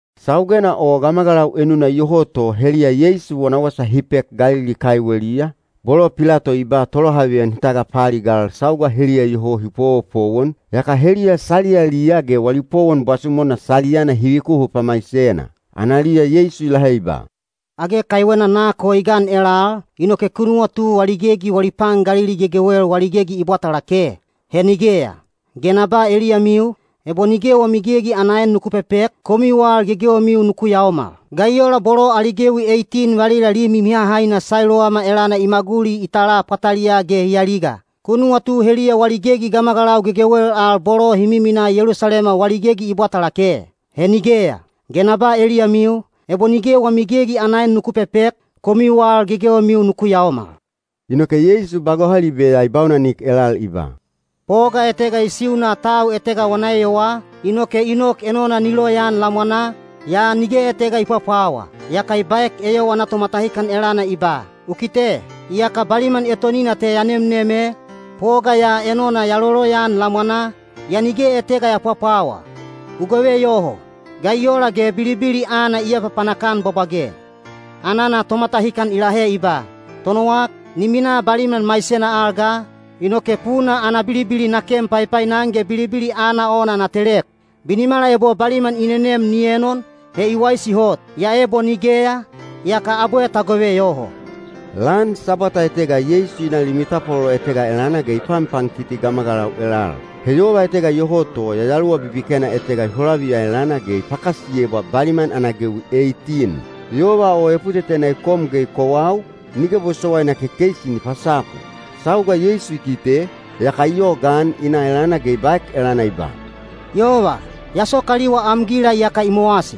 Saugena o gamagalau enuna iyoho to heliya Yeisu wana wasa hi pek Galili kaiweliya, bolo Pilato i ba tolohaveyan hi tagapaaligal sauga heliya iyoho hi powopowon, yaka heliya saliyaliya ge wali powon bwasumona saliyana hi vikuhu pamaisena. Analiya Yeisu i lahe i ba, “Age kaiwena nak o i gan elal, inoke ku nuwatu wali gegi wali pan Galili gegewel wali gegi i bwata lake? He nigeya! Ge na ba eliyamiu, ebo nige wami gegi ana en nuku pepek, komiu al gegewemiu nuku yaomal. Ga i ola bolo ali gewi eitin valila limi mihahaina Sailowama elana i maguli i tala pwataliyaa ge hi aliga? Ku nuwatu heliya wali gegi gamagalau gegewel al bolo hi miminaa Yelusalema wali gegi i bwata lake? He nigeya! Ge na ba eliyamiu, ebo nige wami gegi ana en nuku pepek, komiu al gegewemiu nuku yaomal.” Inoke Yeisu ba gohalibe ya i baunanik elal i ba, “Poga etega i siuna tau etega wana eyowaa, inoke i nok enona ni loyaan lamwanaa, yaa nige etega i pwapwawa. Yaka i baek eyowa ana tomatahikan elana i ba, ‘U kite! Iyaka baliman etonina te ya nemnem e, poga ya enona ya loloyaan lamwanaa, yaa nige etega ya pwapwawa. U gove yoho! Ga i ola ge bilibili aana i apapanak-an bwabwage?’ “Anana tomatahikan i lahe i ba, ‘Tonowak, ni minaa baliman maisena al ga, inoke puna ana bilibili na ken paipainan ge bilibili aana ona na telek. Binimala ebo baliman i nenem ni enon, he i waisi hot. Yaa ebo nigeya, yaka abwe ta gove yoho.’” Lan Sabwata etega Yeisu i na limi tapwalolo etega elana ge i panpankiti gamagalau elal. He yova etega iyoho to yayaluwa bibikena etega i holaviya elana ge i pakasiyebwa baliman ana gewi eitin. Yova o eputetena i kom ge i kowau, nige bosowaina kekeisi ni pasapu. Sauga Yeisu i kite, yaka i yogaan i na elana ge i baek elana i ba, “Yova, ya sokaliwa am gila iyaka i mowasi.”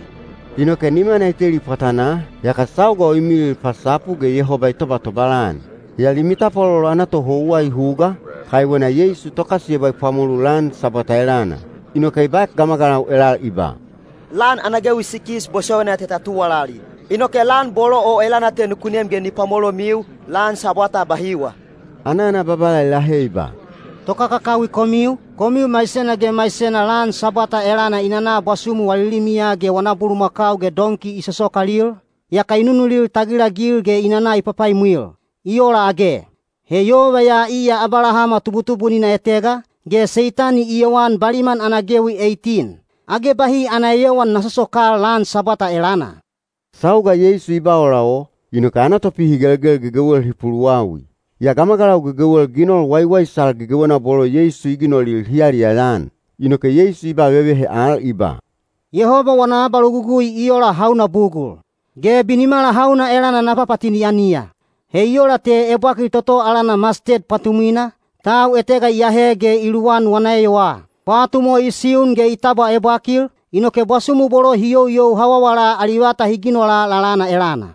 Inoke nimana i teli pwatanaa, yaka sauga o i milil pasapu ge Yehoba i tobatobal-an. Yaa limi tapwalolo ana tohouwa i huga, kaiwena Yeisu tokasiyebwa i pwamolu lan Sabwata elana. Inoke i baek gamagalau elal i ba, “Lan ana gewi sikis bosowaina te ta tuwalali. Inoke lan bolo o elana te nuku nem ge ni pwamolomiu, lan Sabwata bahiwa.” Anana Babala i lahe i ba, “Tokakakawi komiu, komiu maisena ge maisena lan Sabwata elana i nana bwasumu wali limiya ge wana bulumakau ge donki i sosokalil, yaka i nunulil tagilagil ge i nana i papaimwil. I ola age? He yova ya iya Abalahama tubutubunina etega, ge Seitani i yowan baliman ana gewi eitin. Age bahi ana eyowan na sosokal lan Sabwata elana?” Sauga Yeisu i ba ola o, inoke ana topihigelgel gegewel hi puluwawi. Yaa gamagalau gegewel ginol waiwaisal gegewena bolo Yeisu i ginolil hi yaliyaya-an. Inoke Yeisu i ba vevehe al i ba, “Yehoba wana abalogugui i ola hauna bugul? Ge binimala hauna elana na papatini-aniya? He i ola te ebwakil toto alana masted pwatumwina, tau etega i ahe ge i luwan wana eyowaa. Pwatum o i siun ge i tabwa ebwakil, inoke bwasumu bolo hi youyou hawawala ali vata hi ginola lalana elana.”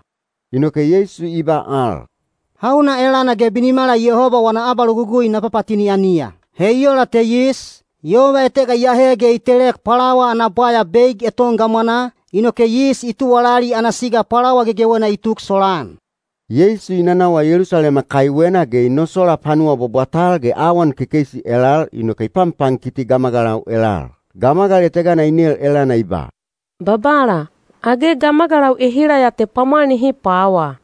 Inoke Yeisu i ba al, “Hauna elana ge binimala Yehoba wana abalogugui na papatini-aniya? He i ola te yis, yova etega i ahe ge i telek pwalawa ana bwaya beig eton gamwanaa, inoke yis i tuwalali ana siga pwalawa gegewena i tuk solaan.” Yeisu i nanawa Yelusalema kaiwena ge i nosola panuwa bwabwatal ge awan kekeisi elal inoke i panpankiti gamagalau elal. Gamagal etegana i nel elana i ba, “Babala, age gamagalau ehila ya te pwamwal nihi pwawa?”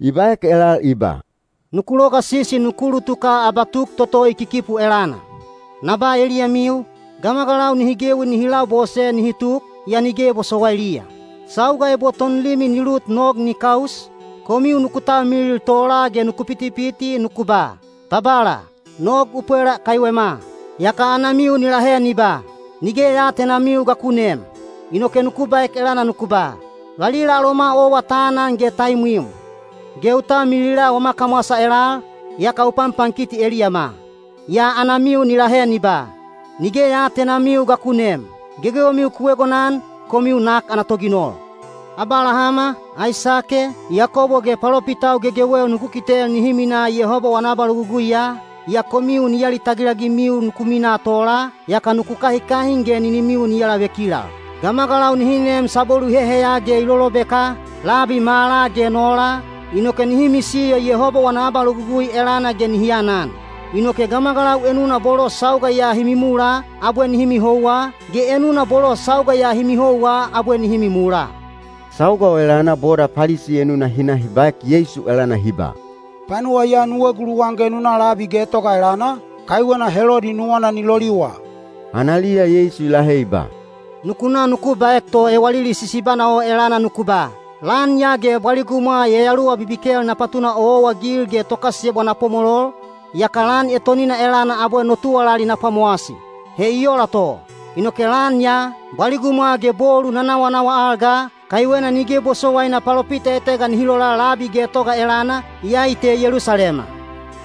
I baek elal i ba, “Nuku logasisi nuku ulutuka abatuk toto i kikipu elana. Na ba eliyamiu, gamagalau nihi gewi nihi labose nihi tuk, yaa nige bosowailiya. Sauga ebo tonlimi ni lut nog ni kaus, komiu nuku talmilil tola ge nuku pitipiti nuku ba, ‘Babala, nog u pwela kaiwema.’ Yaka anamiu ni lahe ni ba, ‘Nige ya aatenamiu ga ku neem.’ Inoke nuku baek elana nuku ba, ‘Valila aloma owa ta anan ge ta imwim. Ge u talmilila wama kamwasa elal, yaka u panpankiti eliyama.’ Yaa anamiu ni lahe ni ba, ‘Nige ya aatenamiu ga ku neem. Gegewemiu ku egonan, komiu nak ana toginol!’ Abalahama, Aisake, Yakobo ge palopitau gegewel nuku kitel nihi minaa Yehoba wana abaloguguiya, yaa komiu ni alitagil-agimiu nuku minaa tola, yaka nuku kahikahin ge ninimiu ni alavekilal. Gamagalau nihi neem sabwelu i heheya ge i lolobeka, labi mala ge nola, inoke nihi misiyo Yehoba wana abalogugui elana ge nihi anan. Inoke gamagalau enuna bolo sauga ya hi mimula, abwe nihi mihouwa, ge enuna bolo sauga ya hi mihouwa abwe nihi mimula.” Sauga o elana boda Palisi enuna hi na hi baek Yeisu elana hi ba, “Panuwa ya nu eguluwan ge nu na labi getoga elana, kaiwena Helodi nuwana ni loliwa.” Analiya Yeisu i lahe i ba, “Nuku na nuku baek to ewalili sisibana o elana nuku ba, ‘Lan ya ge bwaligumwa yayaluwa bibikel na patuna owaowa-agil ge tokasiyebwa na pwamolol, yaka lan etonina elana abwe no tuwalali na pwamowasi.’ He i ola to. Inoke lan ya, bwaligumwa ge bolu na nawanawa al ga, kaiwena nige bosowaina palopita etega nihi lola labi getoga elana, iyai te Yelusalema.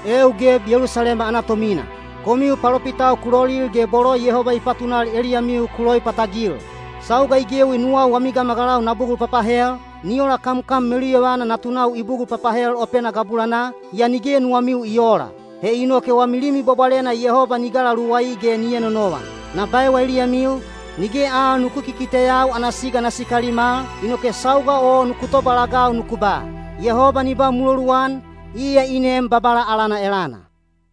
“Eeu geb Yelusalema ana tomina! Komiu palopitau ku lolil ge bolo Yehoba i patunal eliyamiu ku loipatagil. Sauga i gewi nuwau wami gamagalau na bugul papahel, ni ola kamkam meluyovana natunau i bugul papahel opena gabulanaa, yaa nige nuwamiu i oola. He inoke wami Limi Bwabwalena Yehoba ni galaluwai ge ni enonovan. Na baewa eliyamiu, nige al nuku kikiteyau ana siga na sikalim al, inoke sauga o nuku tobalagau nuku ba, ‘Yehoba ni ba muloluan, iya i nem Babala alana elana!’”